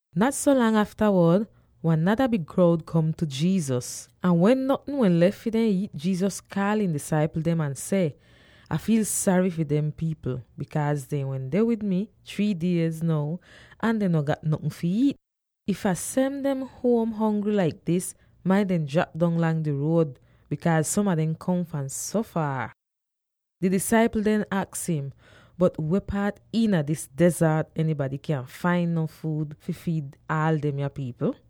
Nat so lang aftawod, wan nada big kroud kom tu Jesus, ahn wen notn wehn lef fi dehn iit, Jesus kaal ihn disaipl dem ahn seh, “Ah fiil sary fi dehn pipl, bikaaz dehn wende wid mi three diez now ahn dehn no gat notn fi iit. If Ah sen dem huom hongry laik dis, dehn maita drap dong lang di ruod, bikaaz som a dem kom fahn so faar.” Di disaipl dem aks im, “Bot weh paat iina dis dezart enybady kyan fain nof fuud fi fiid aal demya pipl?”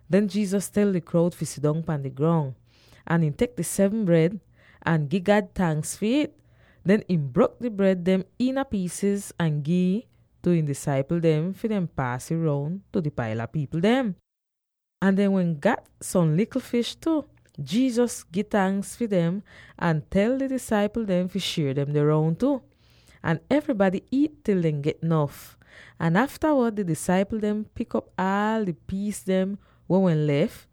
Den Jesus tel di kroud fi sidong pahn di grong, ahn ihn tek di seven bred, ahn gi God tanks fi it. Den ihn brok di bred dem iina piisiz ahn gi'ih tu ihn disaipl dem fi dehn paas ih roun tu di paila pipl dem. Ahn dehn wehn gat som likl fish tu. Jesus gi tanks fi dem, ahn tel di disaipl dem fi shier demde roun tu. Ahn evrybady iit til dehn get nof, ahn aftawod di disaipl dehn pik op aal di piis dem weh wehn lef,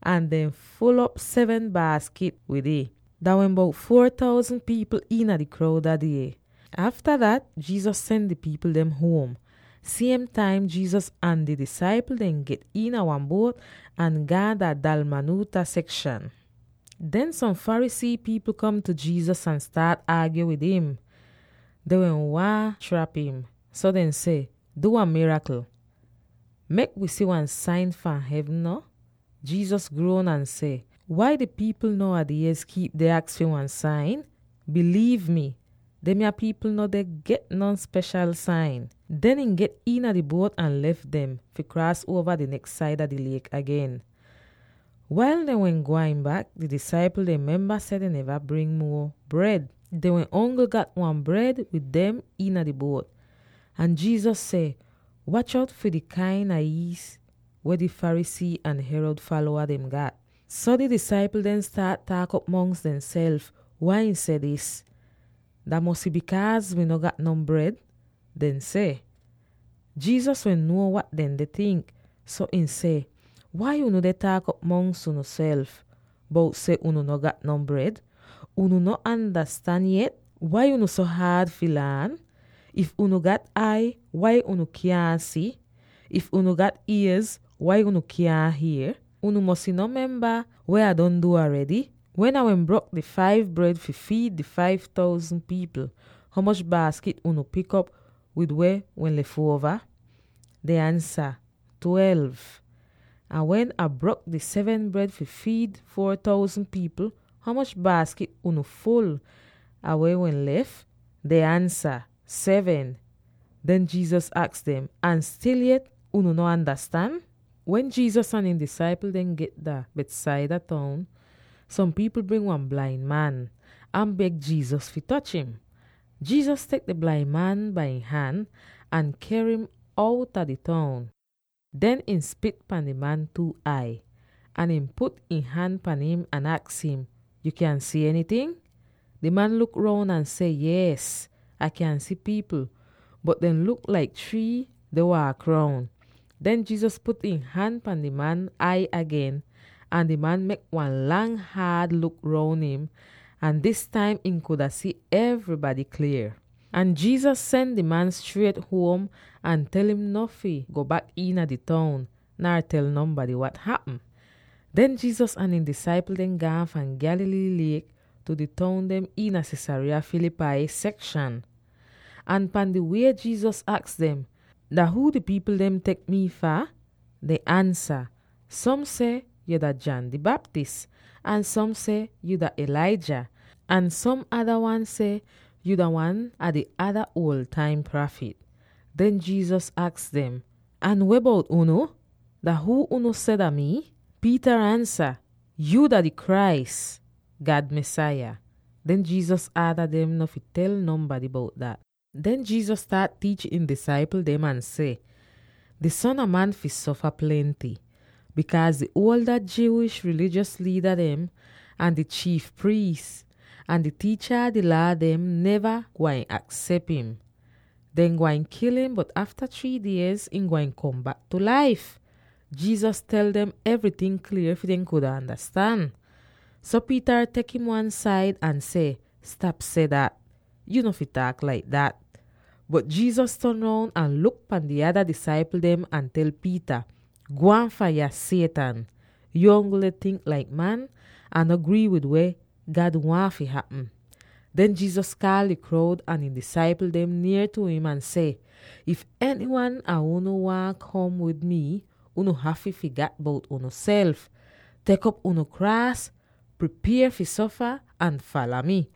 ahn dehn ful'op seven baaskit wid ih! Dah wehn bout four thousand pipl iina di kroud dah die. Afta dat, Jesus sen di pipl dem huom. Siem taim Jesus ahn di disaipl dehn get iina wan buot ahn gaan dah Dalmanutha sekshan. Den som Pharisee pipl kom tu Jesus ahn staat aagyo wid im; dehn wehn waahn trap im. So dehn seh, “Du wan mirakl; mek wi si wan sain fahn hevn no.” Jesus gruon ahn seh, “Wai di pipl now a diez kiip deh aks fi wan sain? Biliiv mi! Demya pipl no deh get non speshal sain.” Den ihn get iina di buot ahn lef dem, fi kraas uova di neks saida di liek agen. Wail dehn wehn gwain bak, di disaipl dehn memba seh dehn neva bring muo bred; dehn wehn ongl gat wan bred wid dem iina di buot. Ahn Jesus seh, “Watch out fi di kain a iis weh di Pharisee ahn Herod falowa dem gat!” So di disaipl dehn staat taak'op mongs dehnself wai ihn seh dis. “Dah mosy bikaaz wi no gat non bred,” dehn seh. Jesus wehn nuo wat dehn deh tink, so ihn seh, “Wai unu deh taak'op mongs unuself, bout seh unu no gat non bred? Unu no andastan yet? Wai unu so haad fi laan? If unu gat ai, wai unu kyaahn si? If unu gat iez, wai unu kyaahn hier? Unu mosy no memba weh Ah don du aredy. Wen Ah wehn brok di five bred fi fiid di five thousand pipl, ho moch baaskit unu pik op wid weh wehn lef uova?” Dehn ansa, “Twelve.” “Ahn wen Ah brok di seven bred fi fiid four thousand pipl, ho moch baaskit unu ful ah weh wehn lef?” Dehn ansa, “Seven.” Den Jesus aks dem, “Ahn stil yet unu no andastan?” Wen Jesus ahn ihn disaipl dem get dah Bethsaida toun, som pipl bring wan blain man, ahn beg Jesus fi toch im. Jesus tek di blain man bai ihn han, ahn ker im outa di toun. Den ihn spit pan di man two ai, ahn ihn put ihn han pan im, ahn aks im, “Yu kyan si enyting?” Di man luk roun ahn seh, “Yees! Ah kyan si pipl, bot dehn luk laik trii deh waak roun!” Den Jesus put ihn han pan di man ai agen, ahn di man tek wan lang haad luk roun im, ahn dis taim ihn kuda si evrybady klier. Ahn Jesus sen di man striet huom ahn tel im no fi go bak iina di toun, [nar tel nonbady wat hapm.] Den Jesus ahn ihn disaipl dehn gaan fahn Galilee liek tu di toun dem iina Caesarea Philippi sekshan. Ahn pan di wie Jesus aks dem, “Dah huu di pipl dem deh tek mii fah?” Dehn ansa, “Som seh yu dah John di Baptist, ahn som seh yu dah Elijah, ahn som ada wan seh yu dah wan a di ada uol taim prafit.” Den Jesus aks dem, “Ahn weh bout unu? Dah huu unu seh dah mii?” Peter ansa, “Yuu dah di Christ, God Mesaya.” Den Jesus aada dem no fi tel nonbady bout dat. Den Jesus staat tiich ihn disaipl dem ahn seh, “Di Son a Man fi sofa plenty, bikaaz di Jewish rilijos liida dem, ahn di chiif priis, ahn di tiicha a di Laa dehn neva gwain aksep im. Dehn gwain kil im, bot afta three diez, ihn gwain kom bak tu laif.” Jesus tel dem evryting klier fi dem kuda andastan. So Peter tek im wan-said ahn seh, “Stap seh dat! Yu no fi taak laik dat!” Bot Jesus ton roun ahn luk pan di ada disaipl dem ahn tel Peter, “Gwaan fahn yah, Satan! Yuu ongl deh tink laik man, ahn no grii wid weh God waahn fi hapm!” Den Jesus kaal di kroud ahn ihn disaipl dem nier tu him ahn seh, “If enywan a unu waahn kom wid mii, unu hafy figat bout unuself, tek op unu kraas —pripier fi sofa— ahn fala mi.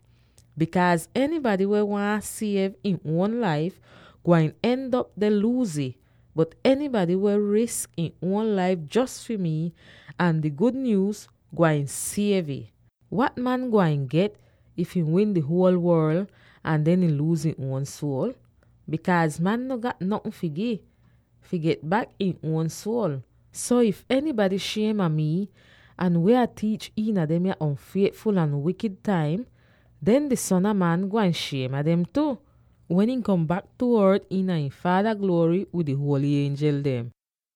Bikaaz enybady weh waahn siev ihn uon laif, gwain end'op deh luuz ih, bot enybady weh wi risk ihn uon laif jos fi mii ahn di gud nyuuz, gwain siev ih. Wat wan man gwain get if ihn win di huol worl, ahn den ihn luuz ihn uon suol? Bikaaz man no gat notn fi gi, fi get bak ihn uon suol! So, if enybady shiem a mii ahn weh Ah tiich iina demya on'fietful ahn wikid taim, den di Son a Man gwain shiem a dem tu, wen ihn kom bak tu ort iina ihn Faada gluory wid di huoly ienjel dem.”